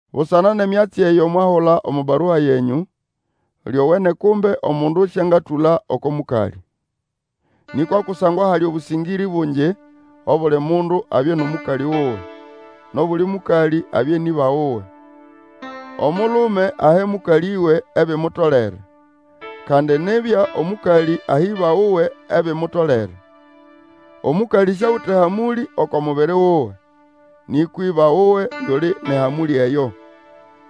Busana nʼemyatsi eyo mwahula omo barua yenyũ, Lyowene kumbe omundu sĩangatũla oko mũkalĩ. Nĩkwa kusangwa hali obũsĩngĩrĩ bungi, obuli mundu abye nʼomũkalĩ wuwe, nʼobuli mũkalĩ abye nʼĩba wuwe. Omulume ahe mũkalĩwe ebimutolere, kandi nibya omũkalĩ ahe ĩba wuwe ebimutolere. Omũkalĩ siawite hamũlĩ oko mubiri wuwe, nĩkwa ĩba wuwe yuli nʼehamũlĩ eyo.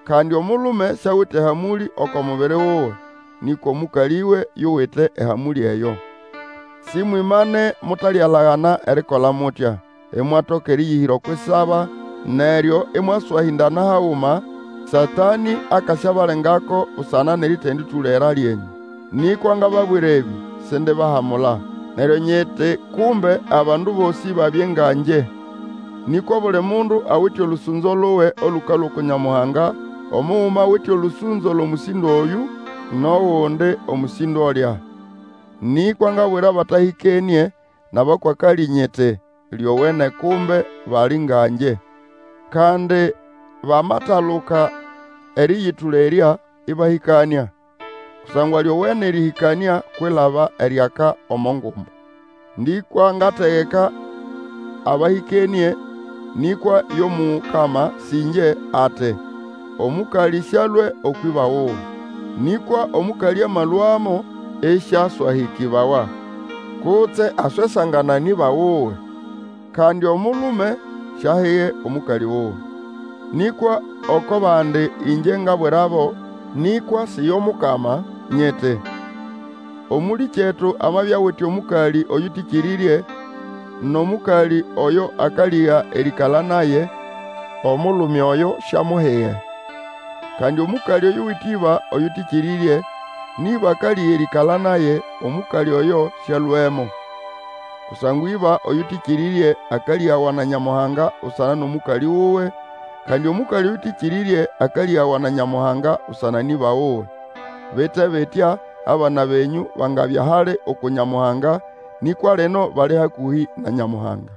Kandi omulume siawite ehamũlĩ oko mubiri wuwe, nĩkwa omũkalĩwe yuwite ehamũlĩ eyo. Sĩmwĩmane mutalialagana erikola mutya, imwatoka erĩyĩhĩra okwʼisaba, neryo ĩmwaswahĩndana haguma, Satanĩ akasyabalengako busana nʼeritindatũlera lyenyũ. Nĩkwa ngababwira ebĩ, sindibahamula. Neryo nyiti kumbe abandu bosĩ babye nga ngye. Nĩkwa obuli mundu awite olũsũnzo luwe olũkalũa uku Nyamuhanga omuguma awite olũsũnzo lʼomũsĩndo oyũ, nʼogundi omũsĩndo olya. Nĩkwa ngabwira abatahĩkenĩe, nʼabakwakalĩ nyiti, lyowene kumbe bali nga ngye. Kandi bamataluka erĩyĩtũlerya, ĩbahĩkanĩa; kusangwa lyowene erĩhĩkanĩa kwilaba eriaka omo ngumbu. Nĩkwa ngategeka abahĩkenĩe, nĩkwa yo Mukama, sĩ ĩngye, ati, Omũkalĩ sĩalũe ũkwʼĩba wuwe. Nĩkwa omũkalĩ amalũamo, ĩsĩaswahĩkĩbawa, kutse aswesangana nʼĩba wuwe. Kandi omulume siahige omũkalĩ wuwe. Nĩkwa oko bandi ĩngye nabwirabo, nĩkwa si yo Mukama, nyiti, Omũlĩkyetu amabya awite omũkalĩ oyũtĩkĩrĩrye, nʼomũkalĩ oyo akalĩga erĩĩkala naye, omulume oyo siamuhige. Kandi omũkalĩ oyuwite ĩba oyũtĩkĩrĩrye, nʼĩba akalĩga erĩĩkala naye omũkalĩ oyo sĩalũemo. Kusangwa ĩba oyũtĩkĩrĩrye akalĩgawa na Nyamuhanga busana nʼomũkalĩ wuwe, kandi omũkalĩ oyũtĩkĩrĩrye, akalĩgawa na Nyamuhanga busana nʼĩba wuwe. Bite bitya, abana benyũ bangabya hali uku Nyamuhanga, nĩkwa lino bali hakũhĩ na Nyamuhanga.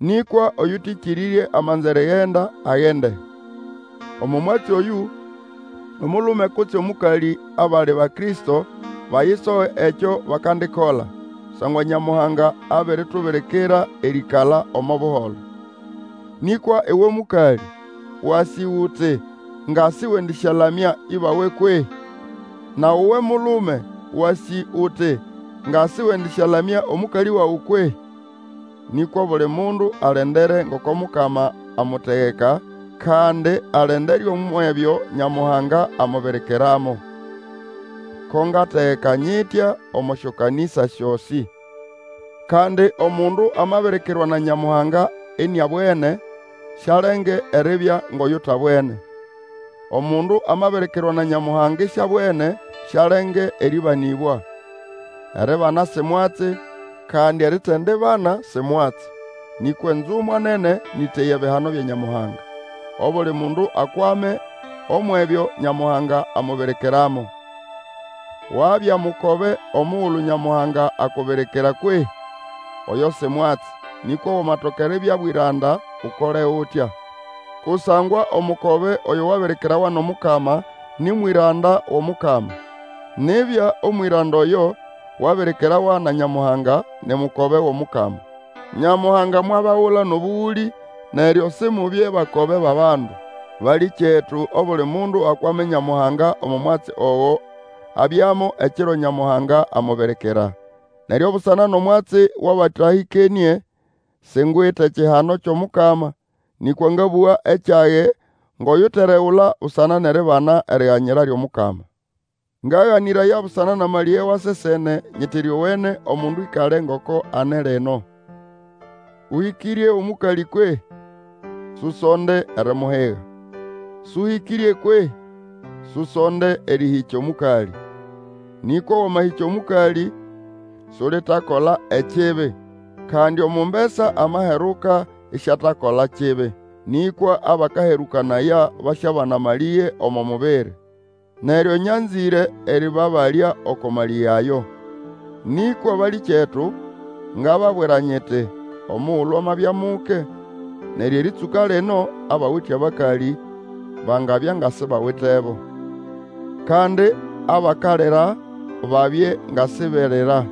Nĩkwa oyũtĩkĩrĩrye amanza erigenda, agende. Omo mwatsi oyũ, omulume kutse omũkalĩ abali Bakristo bayisoge ekyo bakandikola, kusangwa Nyamuhanga abiritubirikira erĩĩkala omo buholo. Nĩkwa uwe mũkalĩ, wasĩ uti nga sĩwendĩsyalamya ĩbawe kwehĩ? Nawe uwe mulume, wasĩ uti nga sĩwendĩsyalamya omũkalĩ wawe kwehĩ? Nĩkwa obuli mundu alendere ngoko Mukama amutegeka, kandi alendere umwʼebyo Nyamuhanga amubirikiramo. Ko ngategeka nyitya omo syokanĩsa syosĩ. Kandi omundu amabirikirwa na Nyamuhanga iniabwene, sialenge eribya ngʼoyutabwene. Omundu amabirikirwa na Nyamuhanga isiabwene, sialenge erĩbanĩbwa. Eribana si mwatsi, kandi eritendibana si mwatsi. Nĩkwa enzumwa nene nĩ ʼteya ebihano bya Nyamuhanga. Obuli mundu akwame umwʼebyo Nyamuhanga amubirikiramo. Wabya mukobe omugulu Nyamuhanga akubirikira kwehĩ? Oyo si mwatsi, nĩkwa wamatoka eribya bwĩranda, Ukole utya. Kusangwa omukobe oyo wabirikirawa nʼomukama nĩ mwĩranda wʼOmukama. Nibya, omwĩranda oyo wabirikirawa na Nyamuhanga, ni mukobe wʼOmukama. Nyamuhanga mwabagula nʼobũgũlĩ; neryo Simubye bakobe bʼabandu. Balĩkyetu, obuli mundu akwame Nyamuhanga omo mwatsi ogo abyamo ekiro Nyamuhanga amubirikira. Neryo busana nʼomwatsi wʼabatahĩkenĩe, singwite kihano kyʼomukama, nĩkwa ngabũga ekyage ngʼoyuteregula busana nʼeribana eriganyira lyʼomukama. Ngaganĩraya busana nʼamalĩge wa sesene, nyiti lyowene omundu ĩkale ngoko ane lino. Ũhĩkĩrye omũkalĩ kwehĩ? Susonde erimuhiga. Sũhĩkĩrye kwehĩ? Susonde erĩhĩkya omũkalĩ. Nĩkwa wamahĩkya omũkalĩ, sulitakola ekibi. Kandi omumbesa amaheruka isiatakola kibi. Nĩkwa abakaherũkanaya basyabana amalĩge omo mubiri, neryo nyanzĩre erĩbabalya oko malĩge ayo. Nĩkwa balĩkyetu, ngababwira nyiti, omugulu amabya muke, neryo erĩtsũka lino, abawite abakalĩ bangabya nga sibawitebo. Kandi abakalira babye nga siberira,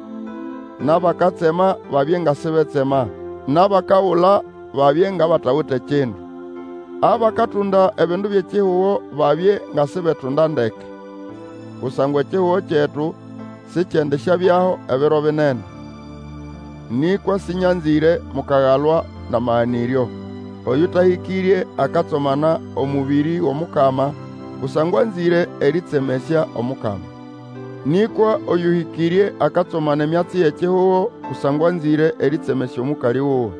nʼabakatsema, babye nga sibetsema, nʼabakagula, babye ngʼabatawite bindu. Abakatunda ebindu byʼekihugo babye nga sibetunda ndeke; kusangwa ekihugo kyetu sikyendisyabyaho ebiro binene. Nĩkwa sĩnyanzĩre mukagalwa nʼamaganĩryo. Oyũtahĩkĩrye akatsomana omũbĩrĩ wʼOmukama, kusangwa anzĩre erĩtsemesya Omukama. Nĩkwa oyũhĩkĩrye akatsomana emyatsi yʼekihugo, kusangwa anzĩre erĩtsemesya omũkalĩ wuwe.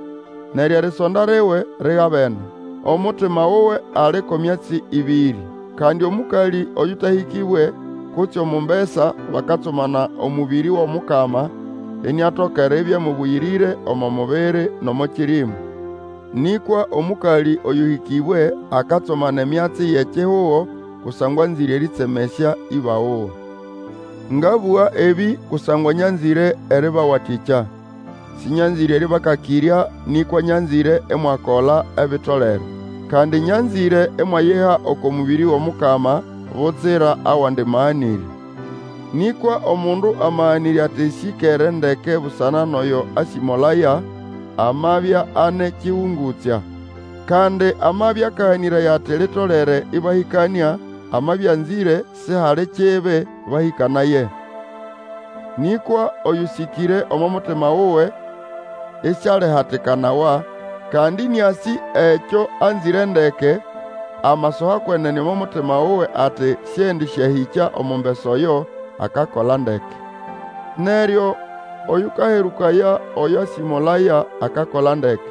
Neryo erisonda liwe ligabene, omutima wuwe ali ko myatsi ĩbĩrĩ. Kandi omũkalĩ oyũtahĩkĩbwe, kutse omumbesa, bakatsomana omũbĩrĩ wʼOmukama, iniatoka eribya mũbũyĩrĩre omo mubiri nʼomo kĩrĩmũ; nĩkwa omũkalĩ oyũhĩkĩbwe akatsomana emyatsi yʼekihugo, kusangwa anzĩre erĩtsemesya ĩba wuwe. Ngabũga ebĩ kusangwa nyanzĩre erĩbawatĩkya. Sĩnyanzĩre erĩbakakĩrya, nĩkwa nyanzĩre imwakola, ebitolere. Kandi nyanzĩre imwayiha oko mũbĩrĩ wʼOmukama, butsira awandi maganĩrya. Nĩkwa omundu amaganĩrya ati syĩkere ndeke busana nʼoyo asĩmolaya, amabya ane kigungutsya. Kandi amabya akaganĩraya ati litolere ĩbahĩkanĩa, amabya anzĩre, sihali kibi, bahĩkanaye. Nĩkwa oyũsĩkĩre omo mutima wuwe, ĩsialihatikanawa, kandi ĩnĩasĩ ekyo anzĩre ndeke, amasoha kwenene omo mutima wuwe ati sĩendĩsyahĩkya omumbesa oyo, akakola ndeke. Neryo oyũkaherũkayaoyo asĩmolaya akakola ndeke,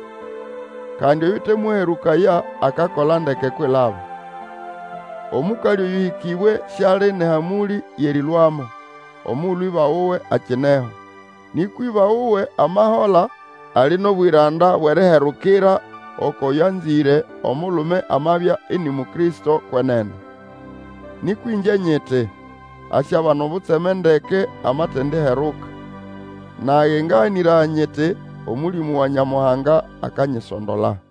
kandi oyũtemũherũkaya akakola ndeke kwilaba. Omũkalĩ oyũhĩkĩbwe siali nʼehamũlĩ yʼerĩlũamo, omugulu ĩba wuwe akineho. Nĩkwa ĩba wuwe amahola, ali nʼobwĩranda bwʼeriherukira okwʼoyo anzĩre, omulume amabya ini Mukristo kwenene. Nĩkwa ĩngye nyiti, asyabana obutseme ndeke amatendiheruka. Nage ngaganĩraya nyiti Omũlĩmũ wa Nyamuhanga akanyisondola.